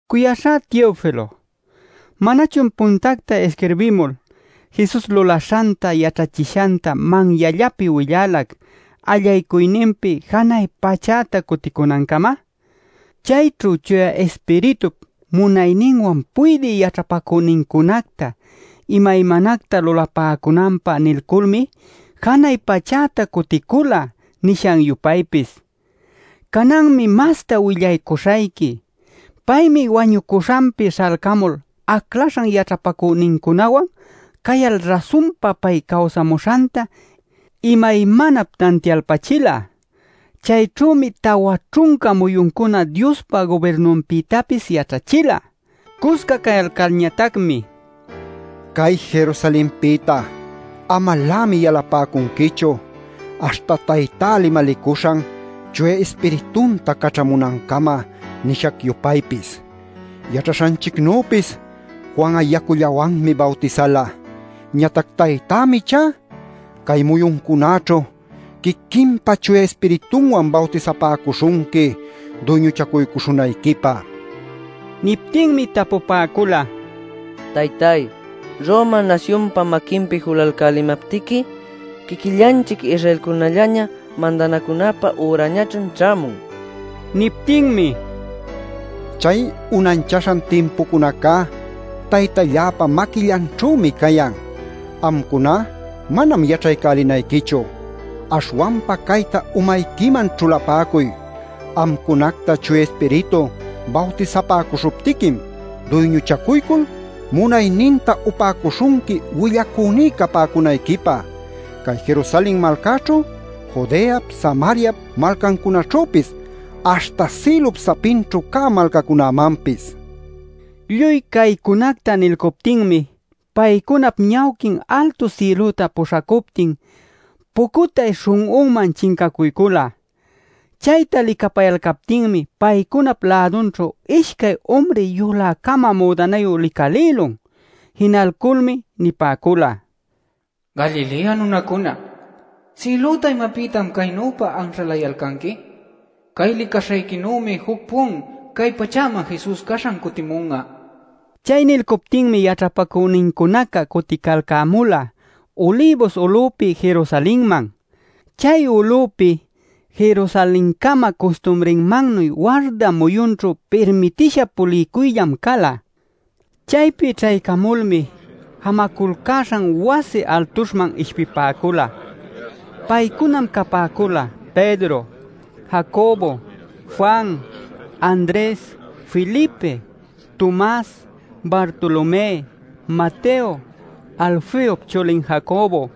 Cuyaśhá Teofilo, ¿manachun puntacta isquirbimul Jesus lulaśhanta yaćhachishanta manyallapi willalac allaycuyninpi janay pachäta cuticunancama? Chayćhu Chuya Ispiritup munayninwan puydï yaćhapacünincunacta imaymanacta lulapäcunanpä nilculmi janay pachäta cuticula nishac-yupaypis. ˻Cananmi masta willaycuśhayqui.˼ Paymi wañuśhanpi śhalcamul aclaśhan yaćhapacünincunawan cayal rasunpa pay cawsamüśhanta imaymanap tantialpachila. Chayćhümi tawa ćhunca muyuncuna Diospa gubirnunpïtapis yaćhachila. Cusca cayalcalñatacmi “Cay Jerusalenpïta amalämi yalapäcunquichu aśhta Taytá limalicuśhan Chuya Ispiritunta caćhamunancama nishac-yupaypis. Yaćhaśhanchicnüpis Juan'a yacullawanmi bawtisala. Ñatac Taytämi ichá cay muyuncunäćhu quiquinpa Chuya Ispiritunwan bawtisapäcuśhunqui duyñuchacuycuśhunayquipä” nila. Niptinmi tapupäcula: “Taytay, ¿Roma nasyunpa maquinpi julalcälimaptiqui quiquillanchic Israelcunällaña mandanacunapä ürañachun ćhämun?” nil. Niptinmi: “Chay unanchaśhan timpucunacá Taytalläpa maquillanćhümi cayan. Amcuná manam yaćhaycälinayquichu. Aśhwanpa cayta umayquiman ćhulapäcuy: amcunacta Chuya Ispiritu bawtisapäcuśhuptiquim duyñuchacuycul munayninta upäcuśhunqui willacüní capäcunayquipä cay Jerusalen malcäćhu, Judeap, Samariap malcancunaćhüpis aśhta sïlup sapinćhu cä malcacunämanpis” nila. Lluy caycunacta nilcuptinmi paycunap ñawquin altu sïlüta puśhacuptin pucutay śhun'unman chincacuycula. Chayta licapayalcaptinmi paycunap lädunćhu ishcay umri yulä-cama müdanayu licalïlun. Jinalculmi nipäcula: “Galilea nunacuna, ¿sïlüta imapïtan caynüpa anśhalayalcanqui? Cay licaśhayquinümi juc-pun cay pachäman Jesus caśhan cutimun'a” nil. Chay nilcuptinmi yaćhapacünincunaca cuticalcämula Ulibus ulüpi Jerusalenman. (Chay ulüpi Jerusalencama custumrinmannuy warda muyunćhu pirmitisha puliycuyllam cala.) Chaypi ćhaycamulmi jamaculcäśhan wasi altuśhman ishpipäcula. Paycunam capäcula Pedro, Jacobo, Juan, Andres, Felipe, Tomas, Bartolomé, Mateo, Alfeop chulin Jacobo,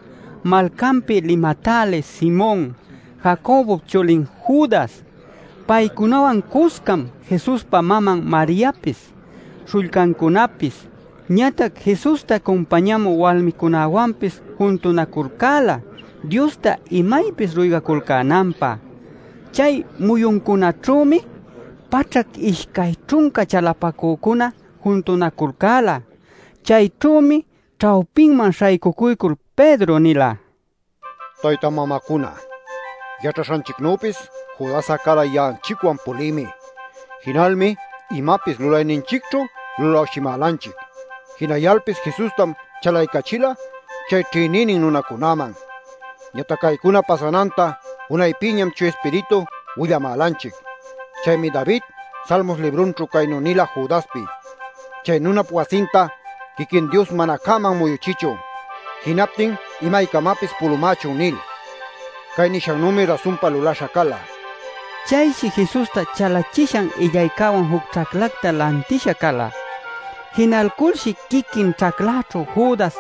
malcanpi limatälï Simon, Jacobop chulin Judas. Paycunawan cuscam Jesuspa maman Mariapis, śhullcancunapis, ñatac Jesusta cumpañamü walmicunäwanpis juntunaculcäla Diosta imaypis ruygaculcänanpä. Chay muyuncunaćhümi paćhac ishcay ćhunca chalapacücuna juntunaculcäla. Chayćhümi ćhawpiman śhaycucuycul Pedro nila: “Tayta mamacuna, yaćhaśhanchicnüpis Judas'a cala ya'anchicwan pulïmi. Jinalmi imapis lulayninchicćhu lulawshimälanchic. Jinayalpis Jesustam chalaycachila chay ćhïnïnin nunacunäman. Ñatac caycuna pasananta unaypïñam Chuya Ispiritu willamälanchic. Chaymi David Salmos librunćhu caynu nila Judaspi: ‘Chay nunap wasinta quiquin Dios mana cäman muyuchichun. Jinaptin imaycamapis pulumächun’ nil. “Cay nishannümi rasunpa lulaśha cala” nila. (Chayshi Jesusta chalachishan illaycäwan juc ćhaclacta lantisha cala. Jinalculshi quiquin ćhacläćhu Judas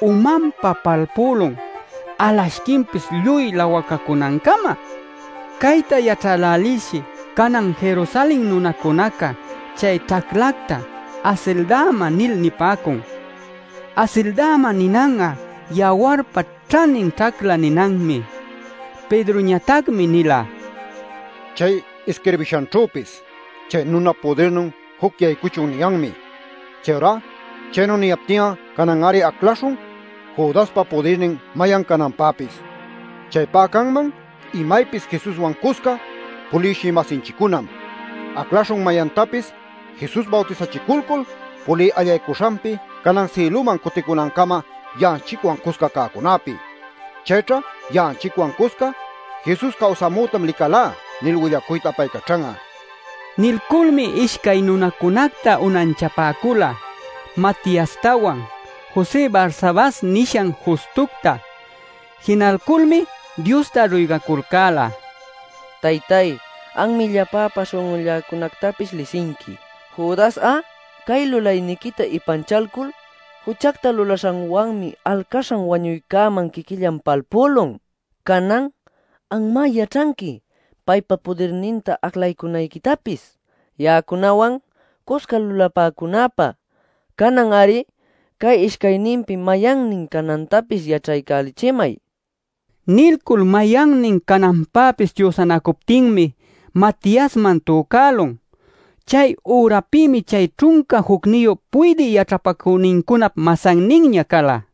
umanpa palpülun alashquinpis lluy lawacacunancama. Cayta yaćhälälilshi canan Jerusalen nunacunaca chay ćhaclacta “Asildama” nil nipäcun. “Asildama” ninan'a “yawarpa ćhanin ćhacla” ninanmi.) Pedroñatacmi nila: “Chay isquirbishanćhüpis: ‘Chay nunap pudirnin juc yaycuchun’ niyanmi. “Chayurá chaynu niyaptin'a canan-ari aclaśhun Judaspa pudirnin mayan cananpäpis. Chaypá canman imaypis Jesuswan cusca puliwshï-masinchiccunam. Aclaśhun mayantapis Jesus bawtisachiculcul pulï allaycuśhanpi canan sïlüman cuticunancama ya'anchicwan cusca cäcunäpi. Chayćha ya'anchicwan cusca ‘Jesus cawsamütam licalá’ nil willacuyta apaycaćhan'a” nil. Nilculmi ishcay nunacunacta unanchapäcula Matiastawan, José Barsabas nishan Justucta. Jinalculmi Diosta ruygaculcäla: “Taytay, anmi llapäpa śhun'ulläcunactapis lisinqui. Judas'a cay lulayniquita ipanchalcul juchacta lulaśhanwanmi alcaśhan wañuycäman quiquillan palpülun. Canan anmá yaćhanqui paypa pudirninta aclaycunayquitapis ya'acunawan cusca lulapäcunäpä. Canan-ari cay ishcayninpi mayannin canantapis yaćhaycälichimay” nil. Nilcul mayannin cananpäpis chüsanacuptinmi Matiasman tücälun. Chay ürapïmi chay ćhunca jucniyu puydï yaćhapacünincunap masanninña cala.